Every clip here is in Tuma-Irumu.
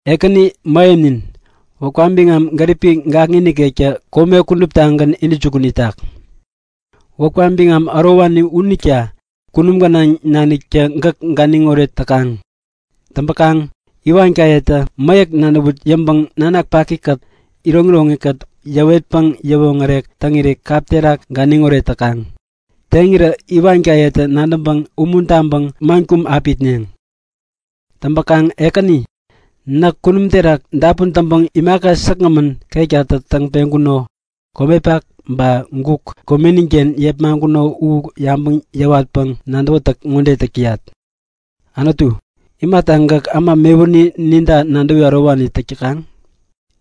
Ekäni Mähemnin, wäpka biŋam gäripi gakŋi nikektä kome kuduptagän intäjukun itak! Wäpka biŋam ärowani unita kunum gänaŋ naniktä gäk ganiŋoret täkaŋ. Täŋpäkaŋ iwankayetä mäyäk nadäwut yäŋpäŋ nanak pakikät iroŋiroŋi yäwetpäŋ yäwoŋärek täŋiri kap terak ganiŋoret täkaŋ. Teŋirä iwankayetä nadäŋpäŋ umuntaŋpäŋ man kum api itneŋ. Täŋpäkaŋ Ekäni, näk kunum terak dapun täŋpäŋ imaka säkgämän ketkatä täŋ peŋkuno, komepak ba guk komeniken yepmaŋkuno u yabäŋ yäwatpäŋ nadäwätäk ŋode täk täyat; Anutu, imata gäk äma mewuni ninta nadäwi ärowani täk täkaŋ?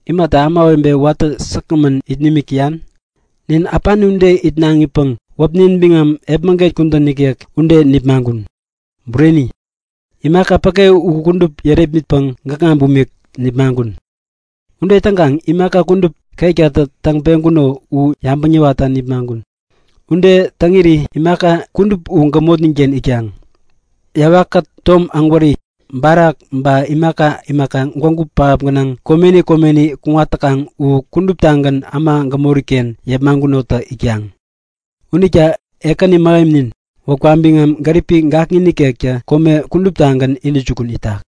Imata ämawebe watä säkgämän it nimik täyan? Nin äpani ude itnaŋipäŋ wäpnin biŋam epmäget kudän nikek ude nipmaŋkun. Bureni, imaka päke u kudup yärepmitpäŋ gäkŋa bumik nipmaŋkun. Ude täŋkaŋ imaka kudup ketkatä täŋ-peŋkuno u yabäŋ yäwatta nipmaŋkun. Ude täŋiri imaka kudup u gämotninken itkaŋ. Yawakkät tom ägwäri, barak ba imaka imaka gwägu pähap gänaŋ komeni komeni kuŋat täkaŋ u kuduptagän äma gämoriken yepmaŋkunotä itkaŋ. Unita Ekäni Mähemnin, wäpka biŋam gäripi gakŋi nikektä kome kuduptagän intäjukun itak!